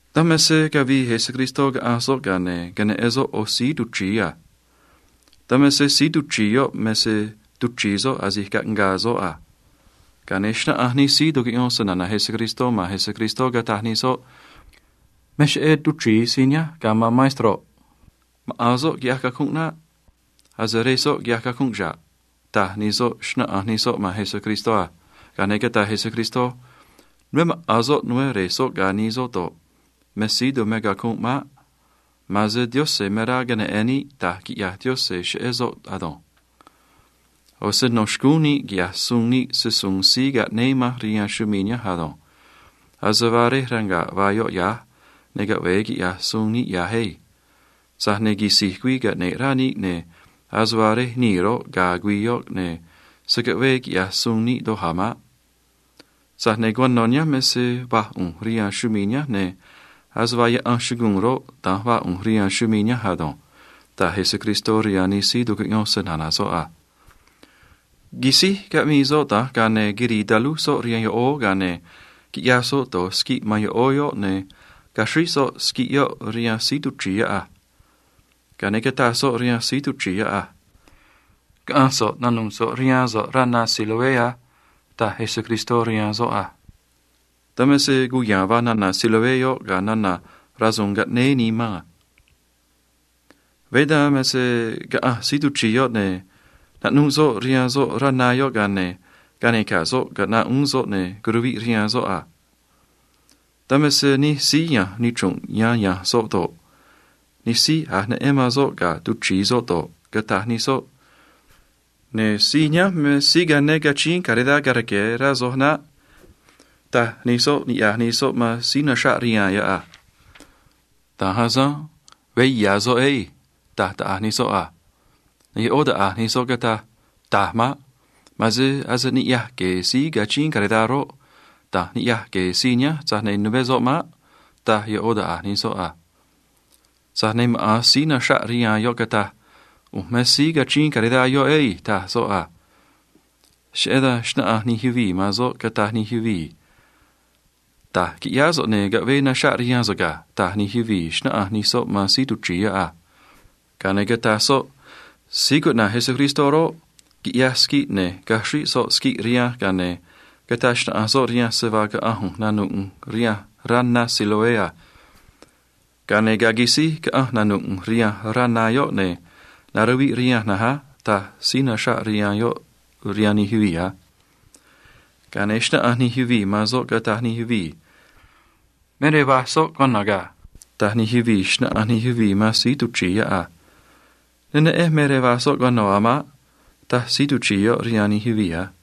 Dan me se cavii Jesucristó caꞌanj soꞌ, ga̱a ne̱ queneꞌen soꞌ ꞌo̱ síí tuchri̱i a. Dan me se síí tuchri̱i yoꞌ me se tuchri̱i soꞌ asi̱j caꞌngaa soꞌ a. Ga̱a ne̱ xnáꞌanj nij síí tucuꞌyón se‑na̱na̱ Jesucristó man Jesucristó, cataj nij soꞌ: ―Me cheꞌé tuchri̱i síí nihánj, ga̱ man maestroꞌ. Maꞌa̱n soꞌ quiꞌyaj cacunꞌ naꞌ. Ase rej soꞌ quiꞌyaj cacunꞌ xa̱ꞌ ―taj nij soꞌ, xnáꞌanj nij soꞌ man Jesucristó a. Ga̱a ne̱ cataj Jesucristó: ―Nuveé maꞌa̱n soꞌ, nuveé re̱j soꞌ ga̱ nii soꞌ do̱ꞌ, me síí tumé cacunꞌ maꞌ. Ma̱a̱n se Diose̱ me rá queneꞌe̱n níꞌ da̱j quiꞌya̱j Diose̱ cheꞌé soꞌ ado̱nj. ꞌO̱ se no̱ xcúún níꞌ quiꞌya̱j suun níꞌ se‑su̱u̱n síí caꞌnéé manj rihaan chumii̱ nihánj ado̱nj. Ase vaa rej ranga̱ꞌ vaa yoꞌ ya̱j, ne̱ caꞌve̱e quiꞌya̱j suun níꞌ ya̱j ei. Tza̱j ne̱ quisi̱j güii caꞌne̱ꞌ rá níꞌ, ne̱ ase vaa rej nii̱ roꞌ, ga̱a̱ güii yoꞌ, ne̱ se̱ caꞌvee quiꞌya̱j suun níꞌ doj a̱ maꞌ. Tza̱j ne̱ cuano̱ nihánj me se va̱j ꞌu̱nj rihaan chumii̱ nihánj, ne̱ ase vaa yaꞌan chuguu̱n roꞌ, da̱nj vaa ꞌu̱nj rihaan chumii̱ nihánj ado̱nj ―taj Jesucristó rihaan nij síí tucuꞌyón se‑na̱na̱ soꞌ a. Quisíj caꞌmii soꞌ da̱nj, ga̱a ne̱ quirii talúj soꞌ rihaan yoꞌóó, ga̱a ne̱ quiꞌyaj soꞌ do̱j siguiꞌ man yoꞌóó yoꞌ, ne̱ caxríj soꞌ siguiꞌ yoꞌ rihaan síí tuchri̱i yoꞌ a. Ga̱a ne̱ cataj soꞌ rihaan síí tuchri̱i yoꞌ a: ―Caꞌa̱nj so̱ꞌ naꞌnu̱ꞌ so̱ꞌ rihaan so̱ꞌ rá na Siloé á ―taj Jesucristó rihaan soꞌ a. Dan me se cuya̱a̱n vaa nana̱ “Siloé” yoꞌ ga̱ nana̱ “rasu̱u̱n caꞌnéé nii man” a. Veé dan me se caꞌanj síí tuchri̱i yoꞌ, ne̱ naꞌnuꞌ soꞌ rihaan soꞌ rá na yoꞌ, ga̱a ne̱ canica̱j soꞌ caꞌnaꞌ uún soꞌ, ne̱ curuviꞌ rihaan soꞌ a. Dan me se nij síí ya̱nj nichru̱nꞌ yan ya̱nj soꞌ do̱ꞌ, nij síí a̱j neꞌen man soꞌ ga̱a tuchri̱i soꞌ do̱ꞌ, cataj nij soꞌ: ―Ne̱ síí nihánj me síí cane cachíín caridad ga̱a rque̱, rá soj naꞌ ―taj nij soꞌ niꞌya̱j nij soꞌ man síí naxraꞌ rihaan yoꞌ a. ―Da̱nj asanj. Veé ya̱ soꞌ ei ―taj taꞌa̱j nij soꞌ a. Ne̱ yoꞌó taꞌa̱j nij soꞌ cataj: ―Taj maꞌ. Ma̱a̱n se ase niꞌya̱j gue̱e̱ síí cachíín caridad roꞌ, da̱nj niꞌya̱j gue̱e̱ síí nihánj, tza̱j ne̱ nuveé soꞌ maꞌ ―taj yoꞌó taꞌa̱j nij soꞌ a. Tza̱j ne̱ maꞌa̱n síí naxraꞌ rihaan yoꞌ cataj: ―ꞌU̱nj me síí cachíín caridad yoꞌ ei ―taj soꞌ a. Cheꞌé dan xnáꞌanj nij yuvii̱ man soꞌ, cataj nij yuvii̱: ―Da̱j quiꞌyáá so̱ꞌ, ne̱ caꞌvee naxraꞌ rihaan so̱ꞌ ga̱ ―taj nij yuvii̱, xnáꞌanj nij soꞌ man síí tuchri̱i yoꞌ a. Ga̱a ne̱ cataj soꞌ: ―Síí cuꞌna̱j Jesucristó roꞌ, quiꞌyaj siguiꞌ, ne̱ caxríj soꞌ siguiꞌ rihanj, ga̱a ne̱ cataj xnaꞌanj soꞌ rihanj se vaa caꞌa̱nj ꞌu̱nj naꞌnu̱ꞌ ꞌu̱nj rihanj rá na Siloé a. Ga̱a ne̱ ga̱a quisíj caꞌanj naꞌnu̱ꞌ ꞌu̱nj rihanj rá na yoꞌ, ne̱ naruviꞌ rihanj na̱nj á ―taj síí naxraꞌ rihaan yoꞌ rihaan nij yuvii̱ a. Ga̱a ne̱ xnáꞌanj nij yuvii̱ man soꞌ, cataj nij yuvii̱: ―Me rej vaj soꞌ cuano̱ ga̱ ―taj nij yuvii̱, xnáꞌanj nij yuvii̱ man síí tuchri̱i yoꞌ a. ―Ne neꞌenj me rej vaj soꞌ cuano̱ a̱ maꞌ ―taj síí tuchri̱i yoꞌ rihaan nij yuvii̱ a.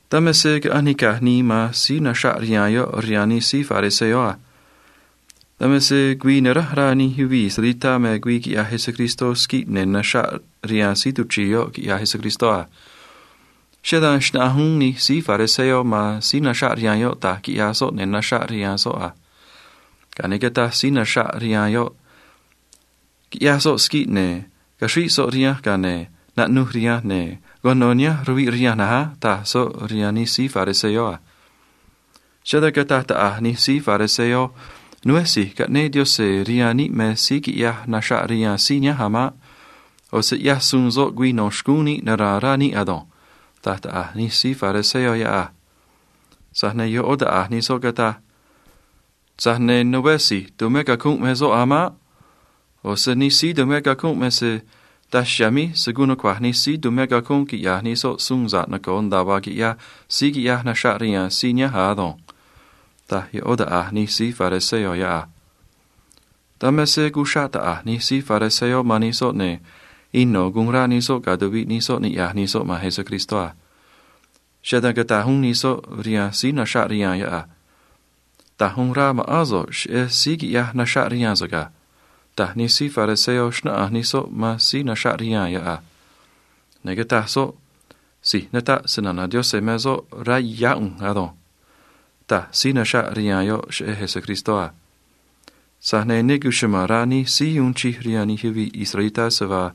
Dan me se caꞌanj nica̱j nii man síí naxraꞌ rihaan yoꞌ rihaan nij síí fariseo a. Dan me se güii naránj rá nij yuvii̱ israelitá me güii quiꞌyaj Jesucristó siguiꞌ ne̱ naxraꞌ rihaan síí tuchri̱i yoꞌ quiꞌyaj Jesucristó a. Cheꞌé dan xnáꞌanj uún nij síí fariseo man síí naxraꞌ rihaan yoꞌ da̱j quiꞌyaj soꞌ ne̱ naxraꞌ rihaan soꞌ a. Ga̱a ne̱ cataj síí naxraꞌ rihaan yoꞌ: ―Quiꞌyaj soꞌ siguiꞌ, ne̱ caxríj soꞌ rihanj, ga̱a ne̱ naꞌnuj rihanj, ne̱ cuano̱ nihánj ruviꞌ rihanj na̱nj á ―taj soꞌ rihaan nij síí fariseo a. Cheꞌé dan cataj taꞌa̱j nij síí fariseo: ―Nuveé si̱j caꞌnéé Diose̱ rihaan níꞌ me síí quiꞌyaj naxraꞌ rihaan síí nihánj a̱ maꞌ. ꞌO̱ se ꞌyaj suun soꞌ güii no̱ xcúún níꞌ nara̱a̱n rá níꞌ ado̱nj ―taj taꞌa̱j nij síí fariseo yoꞌ a. Tza̱j ne̱ yoꞌó taꞌa̱j nij soꞌ cataj: ―Tza̱j ne̱ nuveé si̱j tumé cacunꞌ me soꞌ a̱ maꞌ. ꞌO̱ se nij síí tumé cacunꞌ me se daj chiha̱a̱ míj se̱ guun nucua̱j nij síí tumé cacunꞌ quiꞌya̱j nij soꞌ suun sa̱ꞌ noco̱o nda̱a vaa quiꞌyaj síí quiꞌyaj naxraꞌ rihaan síí nihánj a̱ ado̱nj ―taj yoꞌó taꞌa̱j nij síí fariseo yoꞌ a. Dan me se cuxraꞌ taꞌa̱j nij síí fariseo man nij soꞌ, ne̱ ino̱ guun rá nij soꞌ ga̱ tuviꞌ nij soꞌ niꞌya̱j nij soꞌ man Jesucristó a. Cheꞌé dan cataj uún nij soꞌ rihaan síí naxraꞌ rihaan yoꞌ a: ―Da̱j uun rá ma̱ꞌán so̱ꞌ cheꞌé síí quiꞌyaj naxraꞌ rihaan so̱ꞌ ga̱ ―taj nij síí fariseo, xnáꞌanj nij soꞌ man síí naxraꞌ rihaan yoꞌ a. Ne̱ cataj soꞌ: ―Si̱j nataꞌ se‑na̱na̱ Diose̱ me soꞌ, rá yá ꞌu̱nj ado̱nj ―taj síí naxraꞌ rihaan yoꞌ cheꞌé Jesucristó a. Tza̱j ne̱ ne cuchuma̱n rá nij síí uun chij rihaan nij yuvii̱ israelitá se vaa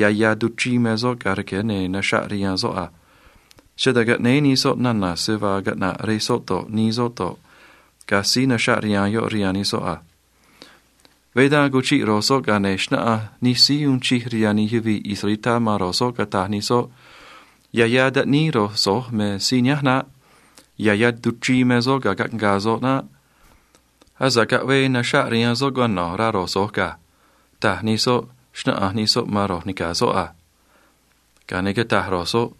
ya̱ ya̱ tuchrii me soꞌ ga̱a rque̱ ne̱ naxraꞌ rihaan soꞌ a. Cheꞌé dan caꞌnéé nij soꞌ nana̱ se vaa caꞌna̱ꞌ rej soꞌ do̱ꞌ, nii soꞌ do̱ꞌ, ga̱ síí naxraꞌ rihaan yoꞌ rihaan nij soꞌ a. Veé dan cuchiꞌ ro̱j soꞌ, ga̱a ne̱ xnáꞌanj nij síí uun chij rihaan nij yuvii̱ israelitá man ro̱j soꞌ, cataj nij soꞌ: ―Ya̱ ya̱ taꞌníí ro̱j so̱j me síí nihánj naꞌ. Ya̱ ya̱ tuchrii me soꞌ ga̱a caꞌngaa soꞌ naꞌ. Asa̱ꞌ caꞌvee naxraꞌ rihaan soꞌ cuano̱, rá ro̱j so̱j ga̱ ―taj nij soꞌ, xnáꞌanj nij soꞌ man ro̱j ni̱ca̱ soꞌ a. Ga̱a ne̱ cataj ro̱j soꞌ: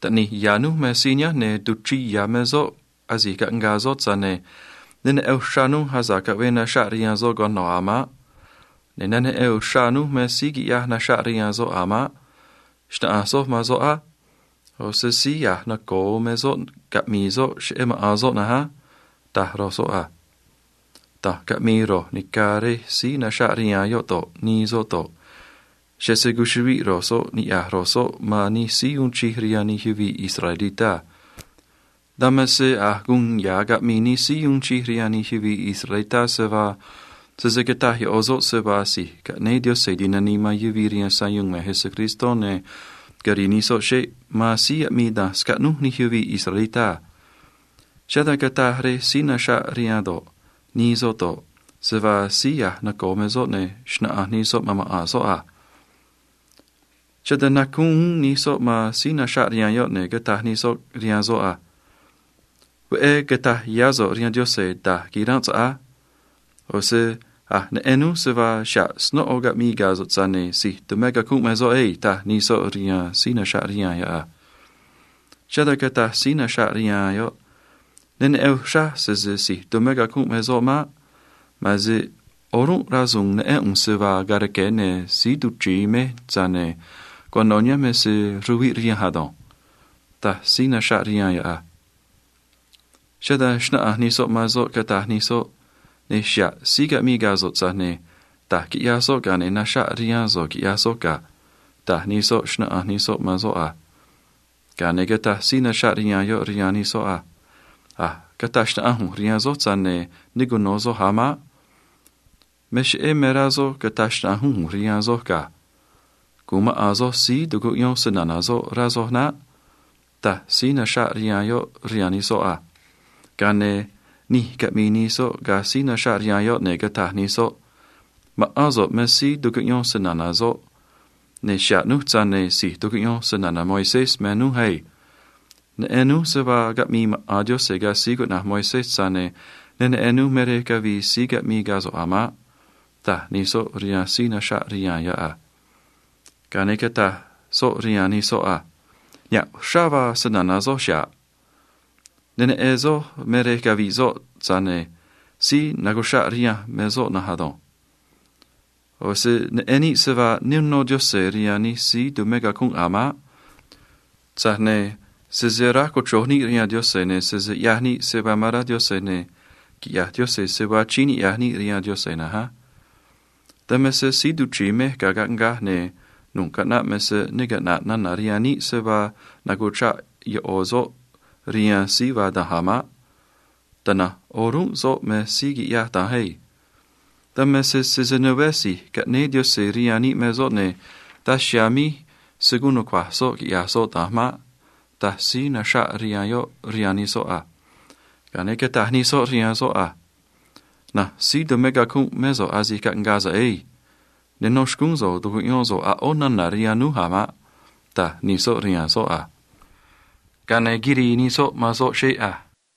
―Taꞌni̱j ya̱ rój me síí nihánj, ne̱ tuchrii ya̱ me soꞌ asi̱j caꞌngaa soꞌ, tza̱j ne̱ ne neꞌen uxrá rój asa̱ꞌ caꞌvee naxraꞌ rihaan soꞌ cuano̱ a̱ maꞌ. Ne̱ ne neꞌen uxrá rój me síí quiꞌyaj naxraꞌ rihaan soꞌ a̱ maꞌ. Xna̱ꞌanj soj man soꞌ á. ꞌO̱ se síí a̱j noco̱o me soꞌ, caꞌmi̱i̱ soꞌ cheꞌé maꞌa̱n soꞌ na̱nj á ―taj ro̱j soꞌ a. Da̱nj caꞌmii ro̱j ni̱ca̱ rej síí naxraꞌ rihaan yoꞌ do̱ꞌ, nii soꞌ do̱ꞌ, cheꞌé se cuchuꞌviꞌ ro̱j soꞌ niꞌya̱j ro̱j soꞌ man nij síí uun chij rihaan nij yuvii̱ israelitá a. Dan me se a̱j guun ya̱ caꞌmii nij síí uun chij rihaan nij yuvii̱ israelitá se vaa sese cata̱j yoꞌo̱ soꞌ se vaa si̱j caꞌnéé Diose̱ ti̱nanii man yuvii̱ rihaan sayuun me Jesucristó, ne̱ quiri̱i̱ nij soꞌ xeꞌ man síí aꞌmii da̱nj scaꞌnúj nij yuvii̱ israelitá a. Cheꞌé dan cataj rej síí naxraꞌ rihaan do̱ꞌ, nii soꞌ do̱ꞌ, se vaa síí a̱j noco̱o me soꞌ, ne̱ xna̱ꞌanj nij soꞌ man maꞌa̱n soꞌ a. Cheꞌé dan nacúún uún nij soꞌ man síí naxraꞌ rihaan yoꞌ, ne̱ cataj nij soꞌ rihaan soꞌ a: ―Veꞌé cata̱j yá so̱ꞌ rihaan Diose̱ da̱j quiránꞌ so̱ꞌ á. ꞌO̱ se a̱j neꞌen núj se vaa xa̱ꞌ snóꞌo caꞌmii ga̱ so̱ꞌ, tza̱j ne̱ si̱j tumé cacunꞌ me soꞌ ei ―taj nij soꞌ rihaan síí naxraꞌ rihaan yoꞌ a. Cheꞌé dan cataj síí naxraꞌ rihaan yoꞌ: ―Ne neꞌen uxraj sese si̱j tumé cacunꞌ me soꞌ maꞌ. Ma̱a̱n se o̱rúnꞌ rasu̱u̱n neꞌén ꞌu̱nj se vaa ga̱a rque̱, ne̱ síí tuchri̱i mej, tza̱j ne̱ cuano̱ nihánj me se ruviꞌ rihanj ado̱nj ―taj síí naxraꞌ rihaan yoꞌ a. Cheꞌé dan xnáꞌanj nij soꞌ man soꞌ, cataj nij soꞌ: ―Ne̱ xa̱ꞌ síí caꞌmii ga̱ so̱ꞌ, tza̱j ne̱ da̱j quiꞌyaj soꞌ, ga̱a ne̱ naxraꞌ rihaan so̱ꞌ quiꞌyaj soꞌ ga̱ ―taj nij soꞌ, xnáꞌanj nij soꞌ man soꞌ a. Ga̱a ne̱ cataj síí naxraꞌ rihaan yoꞌ rihaan nij soꞌ a: ―A̱j cataj xnaꞌanj ꞌu̱nj rihaan soj, tza̱j ne̱ ne cuno̱ soj a̱ maꞌ. Me cheꞌé me rá soj cata̱j xnaꞌanj uún ꞌu̱nj rihaan soj ga̱. Gu̱un maꞌa̱n soj síí tucuꞌyón se‑na̱na̱ soꞌ, rá soj naꞌ ―taj síí naxraꞌ rihaan yoꞌ rihaan nij soꞌ a. Ga̱a ne̱ nij caꞌmii nij soꞌ ga̱ síí naxraꞌ rihaan yoꞌ, ne̱ cataj nij soꞌ: ―Ma̱ꞌán so̱ꞌ me síí tucuꞌyón se‑na̱na̱ soꞌ, ne̱ xa̱ꞌ núj, tza̱j ne̱ si̱j tucuꞌyón se‑na̱na̱ Moisés me núj ei. Neꞌen núj se vaa caꞌmii maꞌa̱n Diose̱ ga̱ síí cuꞌna̱j Moisés, tza̱j ne̱ ne neꞌen núj me rej cavii síí caꞌmii ga̱ so̱ꞌ a̱ maꞌ ―taj nij soꞌ rihaan síí naxraꞌ rihaan yoꞌ a. Ga̱a ne̱ cataj soꞌ rihaan nij soꞌ a: ―Niha̱ꞌ uxrá vaa se‑na̱na̱ soj chiha̱ꞌ. Ne neꞌen soj me rej cavii soꞌ, tza̱j ne̱ síí nacuchraꞌ rihanj me soꞌ na̱nj ado̱nj. ꞌO̱ se neꞌen níꞌ se vaa ne uno Diose̱ rihaan nij síí tumé cacunꞌ a̱ maꞌ. Tza̱j ne̱ sese aráj cochro̱j níꞌ rihaan Diose̱, ne̱ sese ꞌyaj níꞌ se vaa me rá Diose̱, ne̱ quiꞌya̱j Diose̱ se vaa achíín niꞌya̱j níꞌ rihaan Diose̱ na̱nj á. Dan me se síí tuchri̱i mej ga̱a caꞌngaj, ne̱ nu̱ꞌ caꞌnaꞌ me se ne caꞌna̱ꞌ nana̱ rihaan níꞌ se vaa nacuchraꞌ yoꞌo̱ soꞌ rihaan síí vaa da̱nj a̱ maꞌ. Tana̱nj o̱rúnꞌ soꞌ me síí quiꞌyaj da̱nj ei. Dan me se sese nuveé si̱j caꞌnéé Diose̱ rihaan níꞌ me soꞌ, ne̱ daj chiha̱a̱ míj se̱ guun nucua̱j soꞌ quiꞌya̱j soꞌ da̱nj maꞌ ―taj síí naxraꞌ rihaan yoꞌ rihaan nij soꞌ a. Ga̱a ne̱ cataj nij soꞌ rihaan soꞌ a: ―Na̱nj síí tumé cacunꞌ mé so̱ꞌ asi̱j caꞌngaa so̱ꞌ ei. Ne nó xcúún so̱ꞌ tu̱cuꞌyón so̱ꞌ a̱ ꞌó nana̱ rihaan núj a̱ maꞌ ―taj nij soꞌ rihaan soꞌ a. Ga̱a ne̱ quirii nij soꞌ man soꞌ xeꞌ a.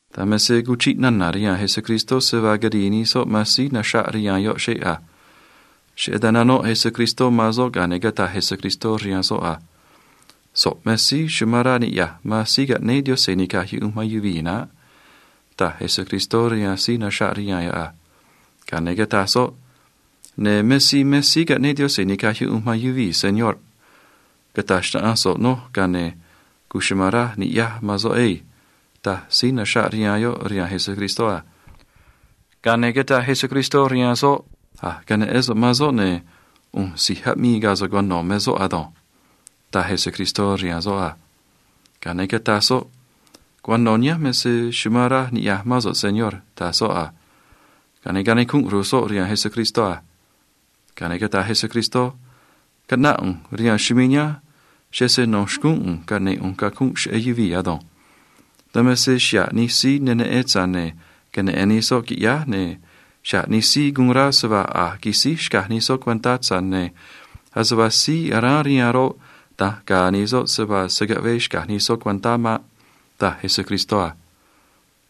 Dan me se cuchiꞌ nana̱ rihaan Jesucristó se vaa quirii nij soꞌ man síí naxraꞌ rihaan yoꞌ xeꞌ a. Cheꞌé dan nanoꞌ Jesucristó man soꞌ, ga̱a ne̱ cataj Jesucristó rihaan soꞌ a: ―So̱ꞌ me síí amán rá niꞌya̱j man síí caꞌnéé Diose̱ ni̱caj yuꞌunj man yuvii̱ naꞌ ―taj Jesucristó rihaan síí naxraꞌ rihaan yoꞌ a. Ga̱a ne̱ cataj soꞌ: ―Ne̱ me síí me síí caꞌnéé Diose̱ ni̱caj yuꞌunj man yuvii̱, señorꞌ. Cata̱j xnaꞌanj so̱ꞌ noj, ga̱a ne̱ cuchuma̱n raj ni̱ꞌyaj man soꞌ ei ―taj síí naxraꞌ rihaan yoꞌ rihaan Jesucristó a. Ga̱a ne̱ cataj Jesucristó rihaan soꞌ: ―A̱j queneꞌén so̱ꞌ man soꞌ, ne̱ ꞌu̱nj si̱j aꞌmii ga̱ so̱ꞌ cuano̱ me soꞌ ado̱nj ―taj Jesucristó rihaan soꞌ a. Ga̱a ne̱ cataj soꞌ: ―Cuano̱ nihánj me se chumán raj niꞌya̱j mán so̱ꞌ, Señor ―taj soꞌ a. Ga̱a ne̱ canicunꞌ ru̱j soꞌ rihaan Jesucristó a. Ga̱a ne̱ cataj Jesucristó: ―Caꞌnáꞌ ꞌu̱nj rihaan chumii̱ nihánj cheꞌé se no̱ xcúún ꞌu̱nj caꞌne̱ꞌ ꞌu̱nj cacunꞌ cheꞌé yuvii̱ ado̱nj. Dan me se xa̱ꞌ nij síí ne neꞌen, tza̱j ne̱ queneꞌe̱n nij soꞌ, qui̱ꞌyáj, ne̱ xa̱ꞌ nij síí guun rá se vaa a̱j quisíj xcaj nij soꞌ cuentá, tza̱j ne̱ ase vaa síí aráán rihaan roꞌ, da̱nj ga̱a̱ nij soꞌ se vaa se̱ caꞌvee xca̱j nij soꞌ cuentá maꞌ ―taj Jesucristó a.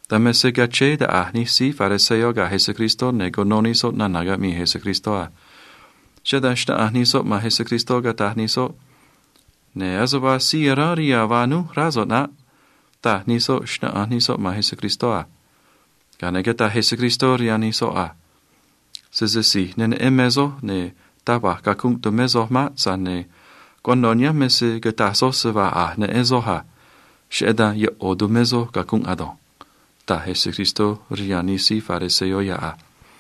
Dan me se cachéé taꞌa̱j nij síí fariseo ga̱ Jesucristó, ne̱ cuno nij soꞌ nana̱ caꞌmii Jesucristó a. Cheꞌé dan xnáꞌanj nij soꞌ man Jesucristó, cataj nij soꞌ: ―Ne̱ ase vaa síí aráán rihaan vaa núj, rá so̱ꞌ naꞌ ―taj nij soꞌ, xnáꞌanj nij soꞌ man Jesucristó a. Ga̱a ne̱ cataj Jesucristó rihaan nij soꞌ a: ―Sese si̱j ne neꞌen me soj, ne̱ taj va̱j cacunꞌ tumé soj maꞌ. Tza̱j ne̱ cuano̱ nihánj me se cataj soj se vaa a̱j neꞌen soj a. Cheꞌé dan yoꞌo̱ tumé soj cacunꞌ ado̱nj ―taj Jesucristó rihaan nij síí fariseo yoꞌ a.